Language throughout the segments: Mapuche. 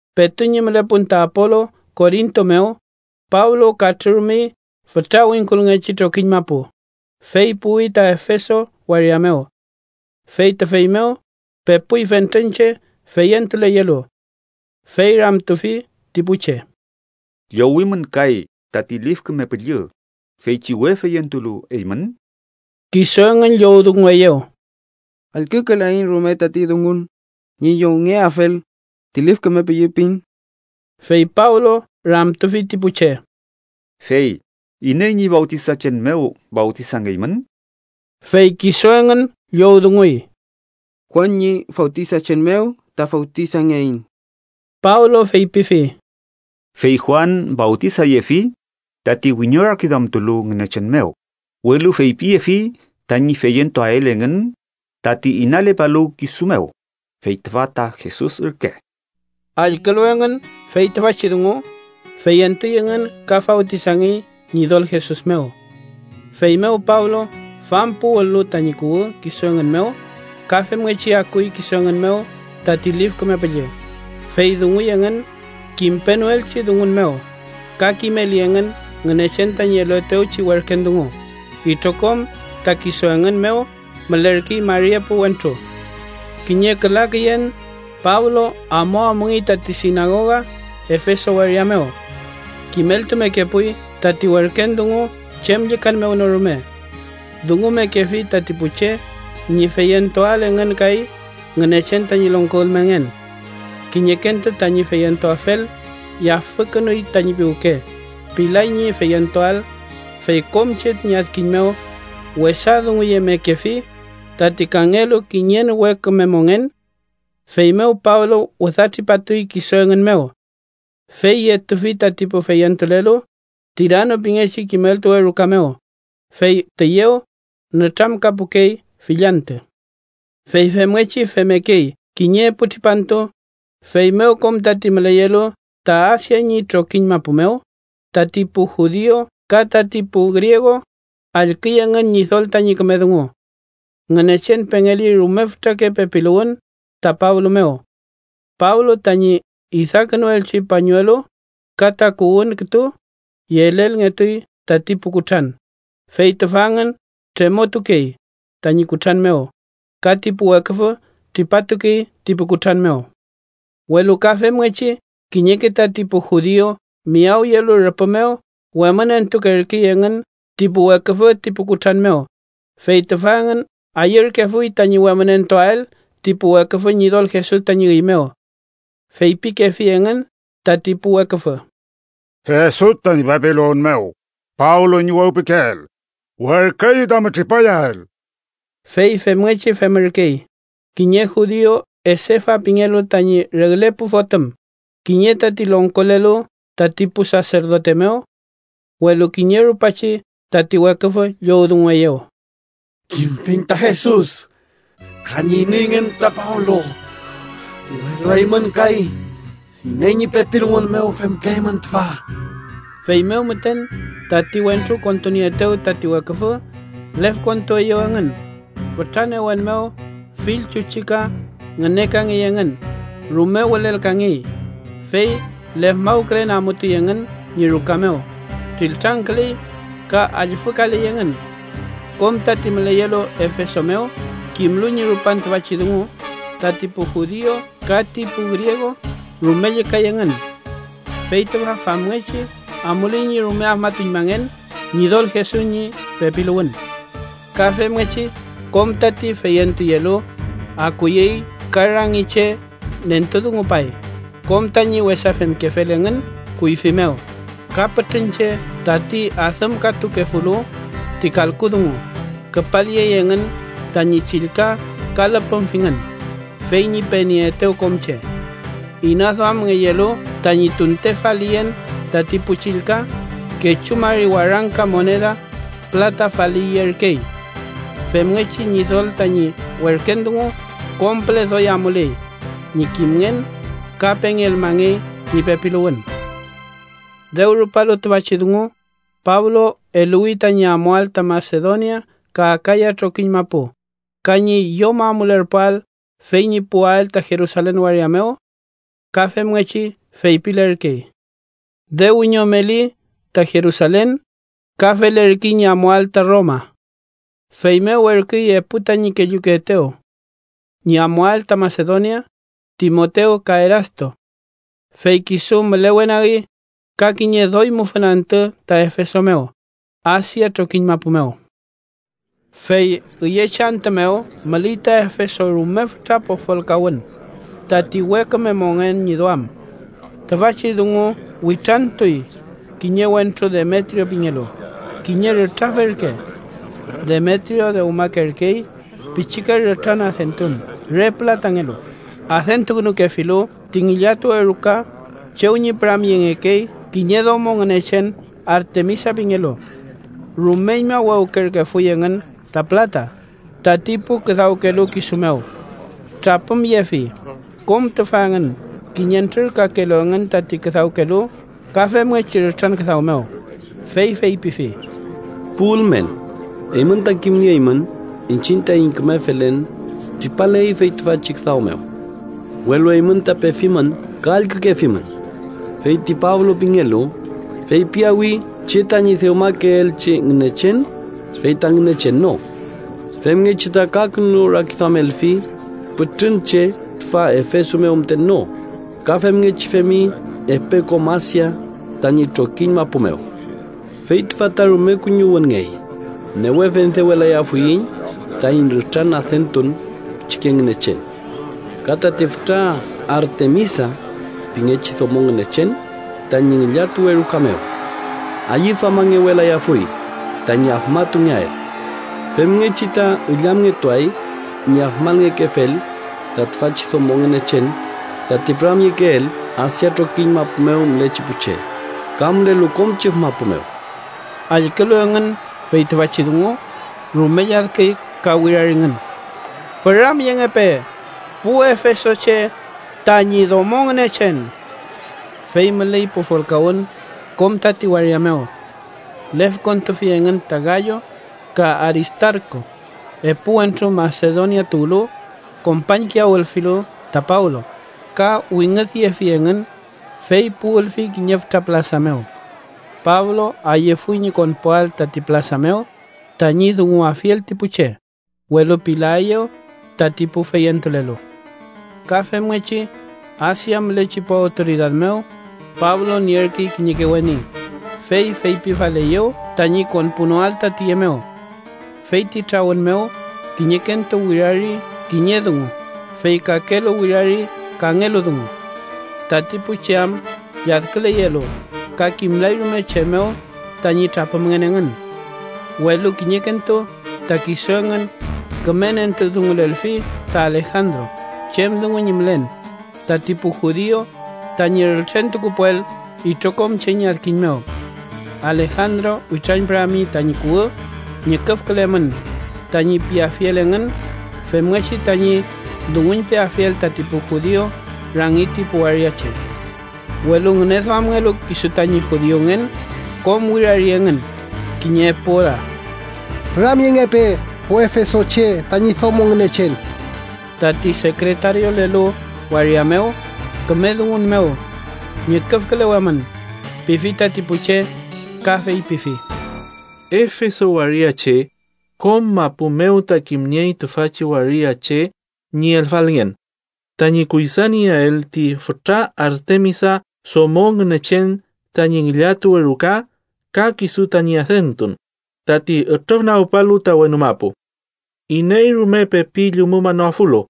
Petu ñi mülepun ta Apolu Korinto mew, Pablo katrürumey fütra wingkulngechi trokiñ mapu, fey puwi ta Efeso waria mew. Fey tüfey mew pepuy fentren che feyentuleyelu. Fey ramtufi ti pu che: —¿Llowimün kay tati Lif Küme Püllü feychi we feyentulu eymün? Kisu engün llowdungueyew: —Allkükelaiñ rume tati dungun ñi llowngeafel ti Lif Küme Püllü pin. Fey Pablo ramtufi ti pu che: —Fey ¿iney ñi fawtisachen mew fawtisangeymün? Fey kisu engün llowdunguy: —Juan ñi fawtisachen mew ta fawtisangeiñ. Pablo feypifi: —Fey Juan fawtisayefi tati wiñorakiduamtulu Ngünechen mew, welu feypiyefi tañi feyentuael engün tati inalepalu kisu mew, fey tüfa ta Jesus ürke. Allkülu engün fey tüfachi dungu, feyentuy engün ka fawtisangey Ñidol Jesus mew. Feymew Pablo fampuwül-lu tañi kuwü kisu engün mew, ka femngechi akuy kisu engün mew tati Lif Küme Püllü, fey dunguy engün kimpenoelchi dungun mew, ka kimeli engün Ngünechen tañi eluetewchi werken dungu. Itrokom ta kisu engün mew mülerkey mari epu wentru. Kiñe küla küyen, Pablo amuamungey tati sinagoga Efeso waria mew. Kimeltumekepuy tati werken dungu chem llükan mew no rume. Dungumekefi tati pu che ñi feyentuael engün kay Ngünechen tañi longko ülmenngen. Kiñekentu tañi feyentuafel yafükünuy tañi piwke, pilay ñi feyentuael, fey kom che ñi adkiñ mew wesa dunguyemekefi tati kangelu kiñen we küme mongen. Feymew Pablo wüdatripatuy kisu engün mew. Fey yetufi tati pu feyentulelu Tirano pingechi kimeltuwe ruka mew, fey tüyew nütramkapukey fill antü. Fey femngechi femmekey kiñe epu tripantu, feymew kom tati müleyelu ta Asia ñi trokiñ mapu mew, tati pu judiu ka tati pu griegu, allküy engün Ñidol tañi küme dungu. Ngünechen pengeli rume fütrake pepiluwün ta Pablo mew. Pablo tañi idakünuelchi pañuelu ka takuwün kütu, yelelngetuy tati pu kutran, fey tüfa engün tremotukey tañi kutran mew ka ti pu weküfü tripatukey ti pu kutran mew. Welu ka femngechi kiñeke tati pu judiu miyawyelu rüpü mew wemünentukerkey engün ti pu weküfü ti pu kutran mew, fey tüfa engün ayürkefuy tañi wemünentuael ti pu weküfü Ñidol Jesus tañi üy mew. Feypikefi engün tati pu weküfü: —¡Jesus tañi pepiluwün mew, Pablo tañi wewpikeel, werküeyu tami tripayael! Fey femngechi femürkey kiñe judiu Esefa pingelu tañi regle pu fotüm, kiñe tati longkolelu tati pu saserdote mew. Welu kiñe rupachi tati weküfü llowdungueyew: —Kimfiñ ta Jesus, ka ñi ineyngen ta Pablo, welu eymün kay, ¿iney ñi pepiluwün mew femkeymün tüfa? Feymew müten, tati wentru kontunieetew tati weküfü, lefkontueyew engün, fütra newen mew fill chuchika ngünekangey engün, rume wülelkangey, fey lefmawkülen amutuy engün ñi ruka mew, triltrangküley ka allfükaley engün. Kom tati müleyelu Efeso mew kimlu ñi rupan tüfachi dungu, tati pu judiu ka ti pu griegu rume llükay engün. Fey tüfa famngechi amuley ñi rume afmatuñmangen Ñidol Jesus ñi pepiluwün. Ka femngechi kom tati feyentuyelu akuyey ka rangi che nentudungupay kom tañi wesa femkefel engün kuyfi mew, ka pütrün che tati adümkatukefulu ti kalku dungu küpalyey engün tañi chillka ka lüpümfingün, fey ñi penieetew kom che. Inaduamngeyelu tañi tunte faliyen tati pu chillka, kechu mari warangka moneda pülata faliyerkey. Femngechi Ñidol tañi werken dungu kom püle doy amuley ñi kimngen ka pengelmangey ñi pepiluwün. Dew rupalu tüfachi dungu, Pablo eluwi tañi amuael ta Masedonia ka Akaya trokiñ mapu, ka ñi yom amulerpuael fey ñi puwael ta Jerusalen waria mew. Ka femngechi feypilerkey: “Dew wiñomeli ta Jerusalen, ka felerkey ñi amuael ta Roma.” Feymew werküy epu tañi kellukeetew ñi amuael ta Masedonia, Timotew ka Erasto. Fey kisu mülewenagi ka kiñe doy mufün antü ta Efeso mew, Asia trokiñ mapu mew. Fey üyechi antü mew müley ta Efeso rume fütra pofolkawün tati we küme mongen ñi duam. Tüfachi dungu witrantuy kiñe wentru Demetrio pingelu, kiñe rütrafe ürke. Demetrio dewmakerkey pichike rütran adentun re pülatangelu, adentukünukefilu ti ngillatuwe ruka chew püramyengekey kiñe domo ngünechen Artemisa pingelu. Rumeñma wewkerkefuy engün ta pülata tati pu küdawkelu kisu mew. Trapümyefi, kom tüfa engün, kiñentrür kakelu engün tati küdawkelu ka femngechi rütran küdaw mew, fey feypifi: “Pu ülmen, eymün ta kimnieymün iñchiñ taiñ küme felen tripaley fey tüfachi küdaw mew. Welu eymün ta pefimün ka allkükefimün, fey ti Pablo pingelu feypiyawi che tañi dewmakeelchi ngünechen fey ta ngünechen no. Femngechi ta kakünurakiduamelfi pütrün che tüfa Efeso mew müten no ka femngechi femi epe kom Asia tañi trokiñ mapu mew. Fey tüfa ta rume kuñiwünngey, newe fendewelayafuiñ taiñ rütran adentun pichike ngünechen. Ka tati fütra Artemisa pingechi domo ngünechen tañi ngillatuwe ruka mew ayüduamangewelayafuy tañi afmatungeael. Femngechi ta illamngetuay ñi afmangekefel ta tüfachi domo ngünechen tati püramyekeel Asia trokiñ mapu mew mülechi pu che ka mülelu kom chüf mapu mew.” Allkülu engün fey tüfachi dungu, rume lladküy ka wiraringün: —¡Püramyengepe pu efesoche tañi domo ngünechen! Fey müley pofolkawün kom tati waria mew. Lefkontufi engün ta Gayo ka Aristarku, epu wentru Masedonia tuwlu kompañkiyawülfilu ta Pablo, ka wingüdyefi engün, fey puwülfi kiñe fütra pülasa mew. Pablo ayüfuy ñi konpuael tati pülasa mew tañi dunguafiel ti pu che, welu pilaeyew tati pu feyentulelu. Ka femngechi Asia mülechi pu awtoridad mew Pablo nierkey kiñeke weni, fey feypifaleyew tañi konpunoael ta tüye mew. Fey ti trawün mew kiñekentu wirari kiñe dungu, fey kakelu wirari kangelu dungu, tati pu che am lladküleyelu ka kimlay rume chem mew tañi trapümngen engün. Welu kiñekentu ta kisu engün küme nentudungulelfi ta Alejandro chem dungu ñi mülen, tati pu judiu tañi rültrentukupuel itrokom che ñi adkiñ mew. Alejandro witrañpürami tañi kuwü “ñüküfkülemün” tañi piafiel engün femngechi tañi dunguñpeafiel tati pu judiu rangi ti pu waria che. Welu ngüneduamngelu kisu tañi judiungen, kom wirari engün kiñe epu ora: “¡Püramyengepe pu efesoche tañi domo ngünechen!” Tati sekretariolelu waria mew, küme dungun mew “ñüküfkülewemün” pifi tati pu che ka feypifi: “Efeso waria che, kom mapu mew ta kimniey tüfachi waria che ñi elfalngen tañi kuydanieael ti fütra Artemisa domo ngünechen tañi ngillatuwe ruka ka kisu tañi adentun, tati ütrüfnagpalu ta wenu mapu. Iney rume pepi llumumanoafulu,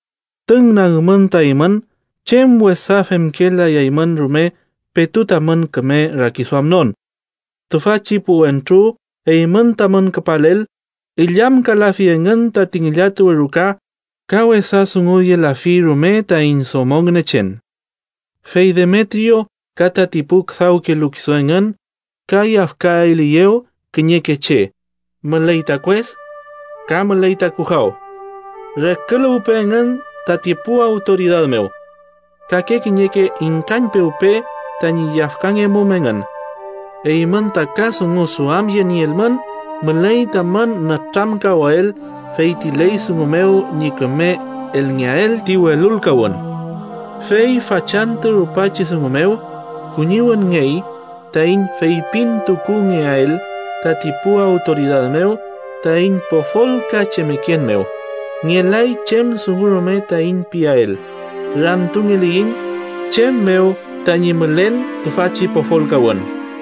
tüngnagmün ta eymün chem wesa femkelayaymün rume petu tamün küme rakiduamnon. Tüfachi pu wentru eymün tamün küpalel illamkalafi engün tati ngillatuwe ruka ka wesa dunguyelafi rume taiñ domo ngünechen. Fey Demetrio ka tati pu küdawkelu kisu engün ka yafkaeliyew kiñeke che, müley ta kues ka müley ta kujaw. Reküluwpe engün tati pu awtoridad mew. Kake kiñeke ingkañpewpe tañi yafkangemum engün. Eymün ta ka dungu duamyenielmün, müley tamün nütramkawael fey ti ley dungu mew ñi küme elngeael ti welulkawün. Fey fachantü rupachi dungu mew kuñiwünngey taiñ feypintukungeael tati pu awtoridad mew taiñ pofolkachemeken mew. Ngelay chem dungu rume taiñ piael, ramtungeliyiñ chem mew tañi mülen tüfachi pofolkawün.”